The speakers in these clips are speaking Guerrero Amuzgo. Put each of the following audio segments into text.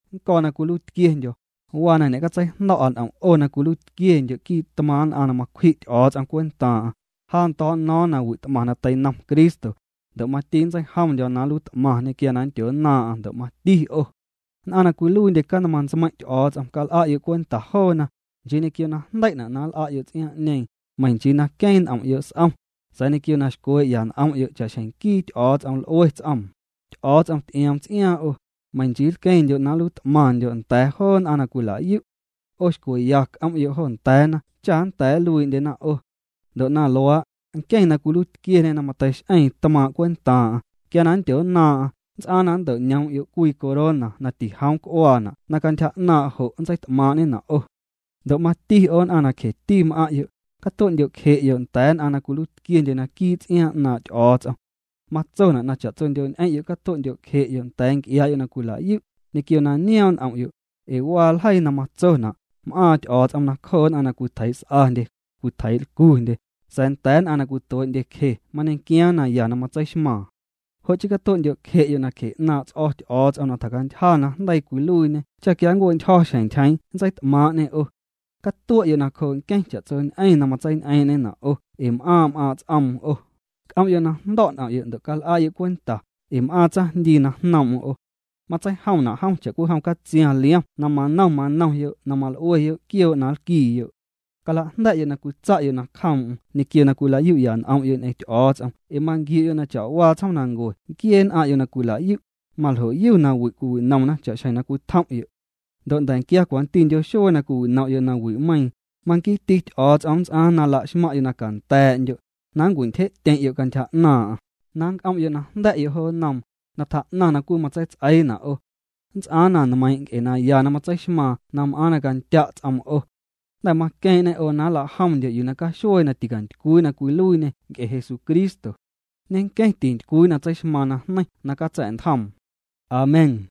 Nnco̱ na cwiluiitquiendyo̱, waa na ñe'catseijndo̱'a n'om' 'o na cwiluiitquiendyo' quii' ntmaaⁿ' nn'aⁿ na macwji' Ty'o̱o̱ts'om cwentaaⁿ'aⁿ, ja na ndo̱o̱'no̱o̱ⁿ na wi't'maⁿ na teinom Cristo, ndo' na mati nntseijomndyo̱ na nluiit'maⁿñê quia na nndyonnaaⁿ'aⁿ ndo' mati 'o. Nn'aⁿ na cwiluiindye canmaⁿ ntsmeiⁿ' Ty'o̱o̱ts'om cal'a'yo' cwenta joona, nchii ñequio najndei'na' na nl'a'yo' ts'iaaⁿ'ñeeⁿ, meiⁿ nchii na queeⁿ n'om'yo' s'om, sa̱a̱ ñequio na xcwee'ya n'om'yo' cha'xjeⁿ nquii Ty'o̱o̱ts'om l'ue ts'oom, Ty'o̱o̱ts'om ty'ioom ts'iaaⁿ 'o, meiⁿ nchii nlqueⁿndyo' na nluiit'maⁿndyo' nda̱a̱ joo nn'aⁿ na cwilayu'. 'O xcweya c'om'yo' jo nda̱a̱na cha nnda̱a̱ nluii'ndyena 'o. Ndo' na luaa', nqueⁿ na cwiluiitquieñê na mateix'eeⁿ tmaaⁿ' cwentaaⁿ'aⁿ, quia na nndyonnaaⁿ'aⁿ, nnts'aaⁿ na nnto'ñoom'yo' cwii corona na tijoom nc'uaana' na cantyja 'naaⁿ' jo' nntseit'maaⁿ'ñena' 'o. Ndo' mati 'o nn'aⁿ na cjeti m'aⁿ'yo', catue'ndyo'cje'yo' nda̱a̱ nn'aⁿ na cwiluiitquiendye naquii' ts'iaaⁿ 'naaⁿ' Ty'o̱o̱ts'om. Matsona' na cha'tsondyo'ñ'eⁿ'yo' catue'ndyo'cje'yo' nda̱a̱ nc'iaa'yo' na cwila'yu' ñequio na nioom' n'om'yo', ee waa ljeii na matsona': M'aaⁿ Ty'o̱o̱ts'om nacjoo nn'aⁿ na cwitjeii's'andye, cwitjeii'lcundye, sa̱a̱ nda̱a̱ nn'aⁿ na cwituee'ndyecje mañequiaaⁿ naya na matseixmaaⁿ. Jo' chii catue'ndyo'cje'yo' nacje 'naaⁿ' ts'o̱ Ty'o̱o̱ts'om na tjacantyja najndeii cwiluiiñê cha quia nncue'ntyjo̱ xjeⁿ ntyjeeⁿ nntseit'maaⁿ'ñê 'o. Catue'yo' nacjoo' nqueⁿ cha'tsoñ'eⁿ na matseiñ'eeⁿ'ñena' 'o ee m'aaⁿ' m'aaⁿ' ts'oom 'o. C'om'yo' na jndo̱' n'om'yo' ndo' cal'a'yo' cwenta, ee m'aaⁿ tsaⁿjndii na jnoom'm 'o. Matseijomna' jom cha'cwijom catsiaⁿ liom na manom manomyo' na mal'ueyo' quioo' na nlquiiyo'. Calajnda̱'yo' na cwitsa'yo' nacjoom'm ñequio na cwila'yu'ya ñ'om'yo' ñ'eⁿ Ty'o̱o̱ts'om ee manquiu'yo' na cha'waa tsjoomnancue nquiee nn'aⁿ'yo' na cwila'yu', maljoyu na wi' cwiwinomna cha'xjeⁿ na cwitjom'yo'. Ndo' nda̱nquia cwantindyo xuee na cwiwinom'yo' nawi'meiiⁿ, manquiiti Ty'o̱o̱ts'om nnts'aaⁿ na laxmaⁿ'yo' na canda̱a̱'ndyo', na nncwintyje'tyeⁿ'yo' cantyja 'naaⁿ'aⁿ, na nc'om'yo' na jnda̱'yo' jo nnoom, na tjaa'naⁿ na cwii nntseits'eiina' 'o. Nnts'aaⁿ na nmeiiⁿ' nc'e naya na matseixmaaⁿ na m'aaⁿ na candya' ts'oom 'o. Jnda̱ maqueeⁿ'ñê 'o na nla'jomndyo' yuu na caxuee na ticantycwii na cwiluiiñê nc'e Jesucristo. Ñenqueⁿ tintycwii na tseixmaaⁿ najneiⁿ na catsa̱'ntjoom. Amén.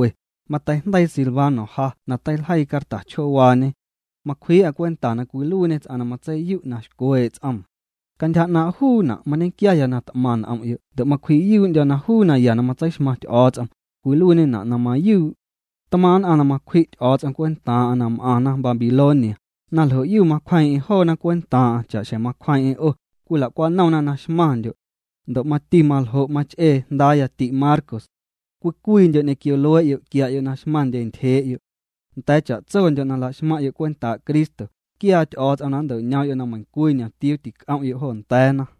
Mateijndeii Silvano ja na teiljeii carta chjoowaañe. Macwjii'a cwenta na cwiluiiñê ts'aⁿ na matseiyu' na xcwee' ts'oom. Cantyja 'naaⁿ' juuna' mañequiaya na t'maⁿ n'om'yo' ndo' macwji'yuu'ndyo̱ na juu naya na matseixmaⁿ Ty'o̱o̱ts'om, cwiluiiñena' na mayuu'. Tmaaⁿ' nn'aⁿ na macwji' Ty'o̱o̱ts'om cwentaaⁿ'aⁿ na m'aⁿna Babilonia, na ljo'yu macwjeeⁿ'eⁿ joona cwentaaⁿ'aⁿ cha'xjeⁿ macwjeeⁿ'eⁿ 'o, cwila'cwanomna na xmaⁿndyo'. Ndo' mati maljo' mach'ee jndaaya ti'Marcos. Cwii cwiindyo' ñequio luee'yo' quia'yo' na xmaⁿndye ntyjee'yo'. Nda̱a̱ cha'tsondyo' na laxmaⁿ'yo' cwentaa' Cristo, quiaa Ty'o̱o̱ts'om na nnto'ñoom'yo' na meiⁿcwii ñomtiuu tinc'om'yo' jo nda̱a̱na.